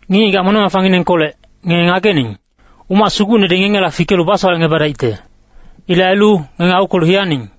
Ngic-ngigac moneng-mafanginengkolec, ngenge ngagening, umac sugucnedi ngengela fikelu basowalecngebadaicte. Ilec ailu, ngenge aukwelu hiyaning.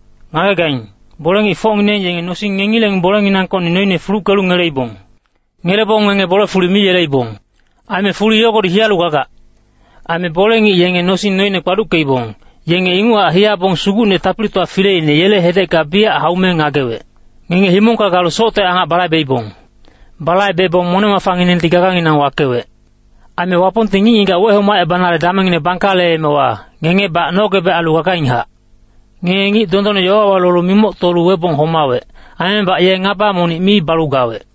Ngagegaing, bole-ngicfocngineng yenge nosing ngengileng bolenginangkocni noine fuluckelu ngeleibong. Ngelebong ngenge bole-fuli mi yeleibong. Aime fuli yogodi hiyalu gagac. Aime bole-ngic yenge nosing noine kpaduckeibong, yenge inguchac hiyabong Sugucne Tapilitowa Fileine, yele hedecka biyac haume ngagewec. Ngenge himongka galu socte angac balaibeibong. Balaibebong moneng-mafanginengti gaganginang wakewec. Aime Wapongti ngic-ngigac wehomacebanale damengngine bangkaleemewa, ngengebac nogebec ailu gagainghac. Ngenge ngic dondonne yowawa lolu mimoctolu webong homawec. Aimebac ye ngaba monic mi balu gawec.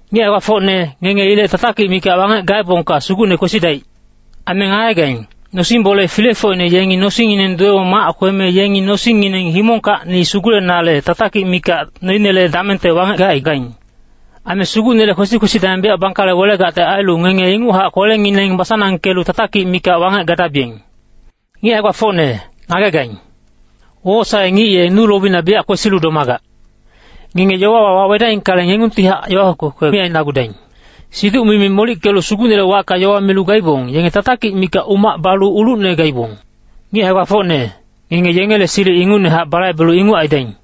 Ngic hae-gbafocne, ngenge ilec tatakic mikac wangec gaebongka Sugucne kwesidaic. Aime ngagegaing, nosing-bole filefocine yengi nosingngineng duwebong mac kweme yengi nosingngineng himongkacni sugulenale tatakic mikac noinele damengte wangec gacaigaing. Aime Sugucnele kwesi-kwesi dameng biyac bangkale welegacte ailu, ngenge inguchac kwelengineng basanangkelu tatakic mikac wangec gadabiyeng. Ngic hae-gbafocne, ngagegaing. Wowosae-ngic ye nu lobina biyac kwesilu domagac. Ngenge yowawa wawedaingkale, ngengungtihac yowa kwekwe mi ainagudaing. Siduc-mimi ngic molickelu Sugucnele wacka yowa milu gaibong, yenge tatakic mikac umac balu ulucne gaibong. Ngic hae-gbafocne, ngenge yengele silic ingucnehac balaibelu inguc aidaing.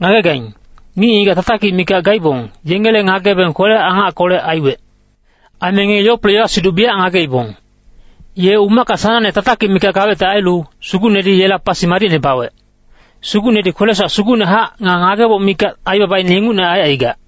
Ngagegaing, ngic-ngigac tatakic mikac gaibong, yengele ngagebeng kwele-angackolec aiwec. Aime ngenge Yople yowa-siduc biyac ngageibong. Ye umacka sanangne tatakic mikac gawecte ailu, Sugucnedi yela pasi madicne bawec. Sugucnedi kwele-sowac sugucnehac, nga ngageboc mikac aibabaine ingucne aicaigac.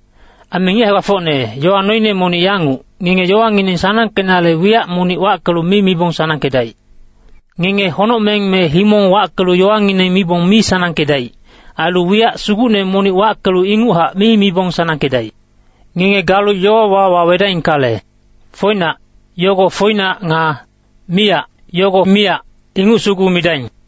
Aime ngic hae-gbafocne, yowa noine monic yanguc, ngenge yowangineng sanangkenale wiyac monic wackelu mi mibong sanangkedaic. Ngenge honocmeng me himong wackelu yowangineng mibong mi sanangkedaic. Ailu wiyac sugucne monic wackelu inguchac mi mibong sanangkedaic. Ngenge galu yowawa wawedaingkale, “foinac” yogo foinac. Nga “miyac” yogo miyac, inguc sugu midaing.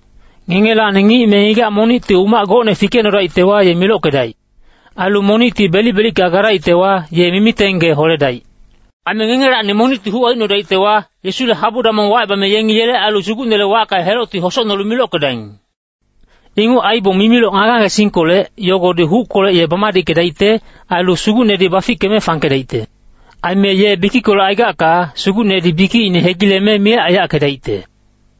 Ngengelacni ngic me ngigac monicti umac gocne fikecnodaictewa, ye milockedaic. Ailu monicti belic-belicka gadaictewa, ye mimiteng gee holedaic. Aime ngengelacni monicti huc aicnodaictewa, Yesule habu damong wacebame yengi yele ailu Sugucnele wacka helocti hosocnolu milockedaing. Inguc aibong mimiloc ngage-ngagesingkolec, yogodi huckolec ye bamadickedaicte. Ailu Sugucnedi bafickeme fangkedaicte. Aime ye bikickolec aigacka, Sugucnedi bikicine hegileme miyac aiyackedaicte.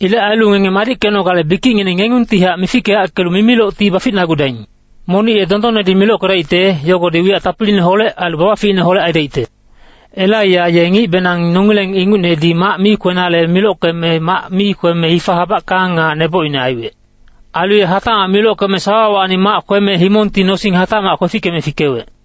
Ilec ailu ngenge madickenogale bikicngineng ngengungtihac mifickeyackelu mimilocti baficnagudaing. Monic ye dondonnedi milockedaicte, yogodi wiyac tapiliineholec ailu babaficineholec aidaicte. Elaiya ye ngicbenang nongileng ingucnedi mac mi kwenale milockeme mac mi kweme hifa habackang nga nebocine aiwec. Ailu ye hatacmac milockeme sawawacni mac kweme himongti nosing hatacmac kwefickeme fikewec.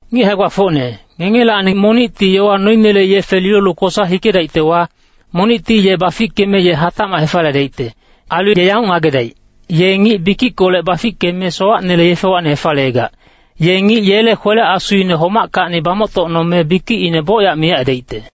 Ngic hae-gbafocne, ngengelacni monicti yowa noinele yefe lilolu kosa hikedaictewa, monicti ye bafickeme ye hatacmac hefaliyedaicte. Ailu ye yanguc ngagedaic, ye ngic bikickolec bafickeme sowacnele yefewacni hefaliyegac, ye ngic yele kwele-asuine homackacni bamoctocnome, bikicine bocyac miyac aidaicte.